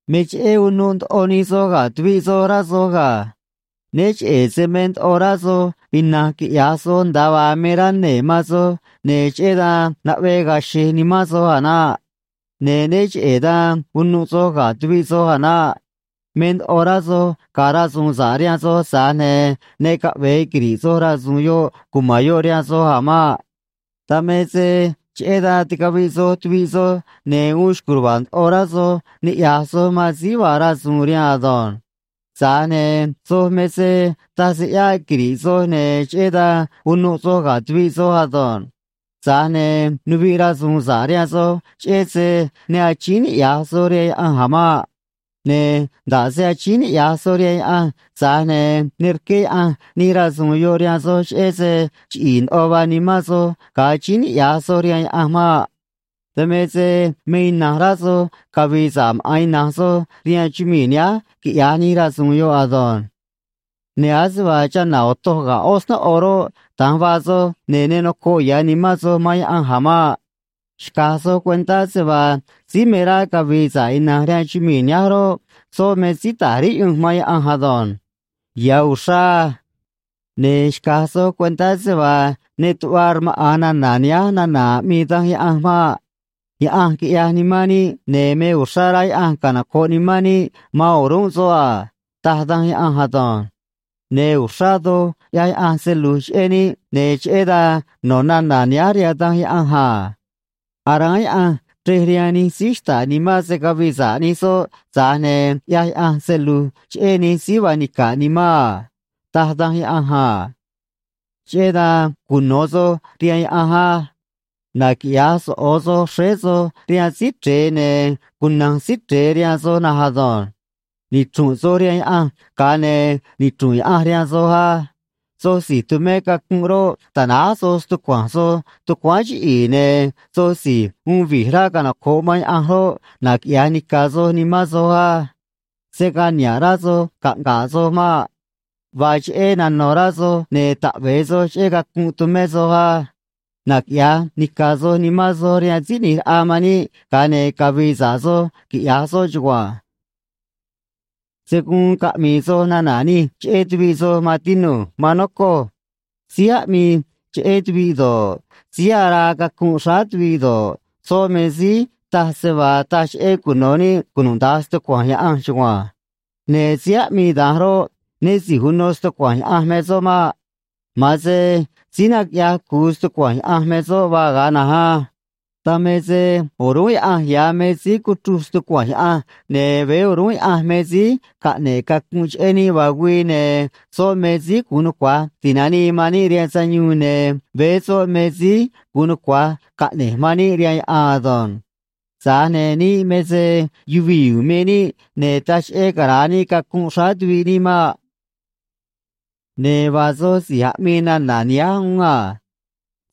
Me cheꞌé unuꞌ ndoꞌo nij soj ga̱ tuviꞌ soj, rá soj ga̱. Né cheꞌe̱ se me ndoꞌo rá soj ina̱nj quiꞌya̱j soj nda̱a vaa me rá nee̱ man soj, ne̱ cheꞌé dan naꞌvee ga̱a̱ xe̱j nimán soj a̱ naꞌ. Ne̱ né cheꞌe̱ dan unuꞌ soj ga̱ tuviꞌ soj a̱ naꞌ. Me ndoꞌo rá soj ga̱a̱ rasu̱u̱n sa̱ꞌ rihaan soj, tza̱j ne̱ ne caꞌve̱e quiri̱ꞌ soj rasu̱u̱n yoꞌ cuma̱n yoꞌ rihaan soj a̱ maꞌ. Dan me se cheꞌé dan ticaviꞌ soj tuviꞌ soj, ne̱ uun xco̱j ruva̱a̱ ndoꞌo rá soj niꞌya̱j soj man síí vaa rasu̱u̱n rihaan ado̱nj. Tza̱j ne̱ soj me se taj se ꞌyáꞌ quiri̱ꞌ soj, ne̱ cheꞌé dan unuꞌ soj ga̱ tuviꞌ soj ado̱nj. Tza̱j ne̱ nuviꞌ rasu̱u̱n sa̱ꞌ rihaan soj, cheꞌé se ne achíín niꞌya̱j soj rihaan Yaꞌanj a̱ maꞌ. Ne̱ nda̱ꞌ se achíín niꞌya̱j soj rihaan Yaꞌanj, tza̱j ne̱ ne rqué Yaꞌanj nij rasu̱u̱n yoꞌ rihaan soj, cheꞌé se chiꞌi̱i̱ ndoꞌo vaa nimán soj ga̱a achíín niꞌya̱j soj rihaan Yaꞌanj maꞌ. Dan me se me ina̱nj rá soj cavi̱i̱ sa̱ꞌ maꞌa̱n ina̱nj soj rihaan chumii̱ nihánj quiꞌya̱j nij rasu̱u̱n yoꞌ ado̱nj. Ne̱ ase vaa chana̱ otoj ga̱ ꞌó snóꞌo roꞌ, da̱nj vaa soj, ne̱ ne nocoꞌ ya̱ nimán soj man Yaꞌanj a̱ maꞌ. Xca̱j soj cuentá se vaa síí me rá cavi̱i̱ sa̱ꞌ ina̱nj rihaan chumii̱ nihánj roꞌ, soꞌ me síí ta̱j riꞌyunj man Yaꞌanj ado̱nj. Ya̱ uxrá á. Ne̱ xca̱j soj cuentá se vaa ne tuꞌva rmaꞌa̱n nana̱ nihánj nana̱ aꞌmii Danj Yaꞌanj maꞌ: “Yaꞌanj quiꞌyaj nimán níꞌ, ne̱ me uxrá rá Yaꞌanj canoco̱ꞌ nimán níꞌ man o̱rúnꞌ soꞌ a”, taj Danj Yaꞌanj ado̱nj. Ne̱ uxrá doj ꞌyaj Yaꞌanj se lu̱j cheꞌé níꞌ, ne̱ cheꞌé dan no̱ nana̱ nihánj rihaan Danj Yaꞌanj a: “Aráán Yaꞌanj chrej rihaan nij síí xta̱ꞌ nimán se̱ cavii sa̱ꞌ nij soꞌ, tza̱j ne̱ ꞌyaj Yaꞌanj se lu̱j cheꞌé nij síí vaa nica̱ꞌ nimán a”, taj Danj Yaꞌanj a. Cheꞌé dan cuno̱ soj rihaan Yaꞌanj á. Naquiꞌya̱j soꞌo̱ soj xréé soj rihaan Síí Chre̱e, ne̱ cuna̱nj Síí Chre̱e rihaan soj na̱nj ado̱nj. Nichru̱nꞌ soj rihaan Yaꞌanj, ga̱a ne̱ nichru̱nꞌ Yaꞌanj rihaan soj á. Soj si̱j tumé cacunꞌ roꞌ, ta̱náj soj stucua̱nj soj tucuáán chiꞌi̱i̱, ne̱ soj si̱j uun vi̱j rá canoco̱ꞌ man Yaꞌanj roꞌ, naquiꞌya̱j nica̱ soj nimán soj á. Se̱ gaa niha̱ꞌ rá soj caꞌnga̱ꞌ soj maꞌ. Vaa cheꞌé nano̱ rá soj ne̱ taꞌve̱e soj cheꞌé cacunꞌ tumé soj á. Naquiꞌya̱j nica̱ꞌ soj nimán soj rihaan Síí ꞌNi̱j Raꞌa man níꞌ, ga̱a ne̱ cavi̱i̱ sa̱ꞌ soj, quiꞌya̱j soꞌ chugua̱nj. Se̱ guun caꞌmi̱i̱ soj nana̱ nij cheꞌé tuviꞌ soj, maan tinu̱j, maan nocoj. Síí aꞌmii cheꞌé tuviꞌ do̱ꞌ, síí araa cacunꞌ xráá tuviꞌ do̱ꞌ, soꞌ me síí taj se vaa taj cheꞌé cuno̱ níꞌ cunuda̱nj stucua̱nj Yaꞌanj chugua̱nj. Ne̱ síí aꞌmii da̱nj roꞌ, né si̱j uno stucua̱nj Yaꞌanj me soꞌ maꞌ. Ma̱an se síí naquiꞌyaj cu̱u stucua̱nj Yaꞌanj me soꞌ vaa ga̱a na̱nj á. Dan me se o̱rúnꞌ Yaꞌanj ya̱ me síí cuchruj stucua̱nj Yaꞌanj, ne̱ veé o̱rúnꞌ Yaꞌanj me síí caꞌne̱ꞌ cacunꞌ cheꞌé níꞌ vaa güii, ne̱ soꞌ me síí gu̱un nucua̱j ti̱nanii man níꞌ rihaan sayuun, ne̱ veé soꞌ me síí gu̱un nucua̱j caꞌne̱j man níꞌ rihaan yaꞌan ado̱nj. Tza̱j ne̱ níꞌ me se yuvii̱ u̱u̱n me níꞌ, ne̱ taj cheꞌé cara̱a níꞌ cacunꞌ xráá tuviꞌ níꞌ maꞌ. Ne̱ vaa soj si̱j aꞌmii nana̱ nihánj uún a: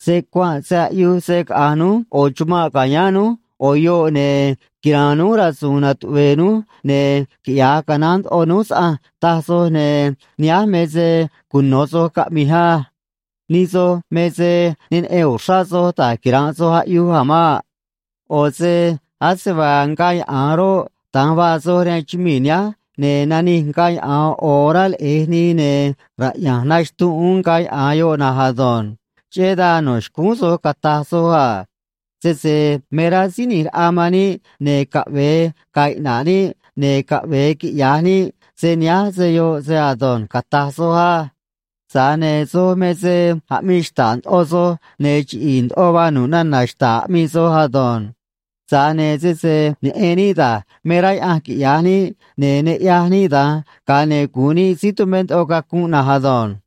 “Se cuanꞌ se aꞌyuj se caꞌa̱nj núj ꞌo̱ chumanꞌ ca̱yáán núj ꞌo̱ yoꞌ, ne̱ quira̱a̱n núj rasu̱u̱n natuꞌve̱e̱ núj, ne̱ quiꞌya̱j canaán ndoꞌo núj saꞌanj”, taj soj, ne̱ nihánj me se cuno̱ soj caꞌmi̱j á. Nij soj me se ne neꞌen uxrá soj da̱j quira̱nꞌ soj aꞌyuj a̱ maꞌ. ꞌO̱ se ase vaa ngaa yaꞌa̱an roꞌ, da̱nj vaa soj rihaan chumii̱ nihánj, ne̱ nanij ngaa yaꞌa̱an ꞌo̱ orá leꞌe̱j nii, ne̱ raꞌya̱nj naxtunꞌ uún ngaa yaꞌa̱an yoꞌ na̱nj ado̱nj. Cheꞌé dan no̱ xcúún soj cata̱j soj a: “Sese me rá Síí ꞌNi̱j Raꞌa man níꞌ, ne̱ caꞌve̱e ga̱a̱ iꞌna̱ꞌ níꞌ, ne̱ caꞌve̱e quiꞌya̱j níꞌ se nihánj se yoꞌ se ado̱nj”, cata̱j soj á. Tza̱j ne̱ soj me se aꞌmii xta̱ꞌ ndoꞌo soj, ne̱ chiꞌi̱i̱ ndoꞌo vaa nu̱ꞌ nana̱ xta̱ꞌ aꞌmii soj ado̱nj. Tza̱j ne̱ sese neꞌen níꞌ da̱j me rá Yaꞌanj quiꞌya̱j níꞌ, ne̱ ne ꞌyaj níꞌ da̱nj, ga̱a ne̱ gu̱un níꞌ síí tumé ndoꞌo cacunꞌ na̱nj ado̱nj.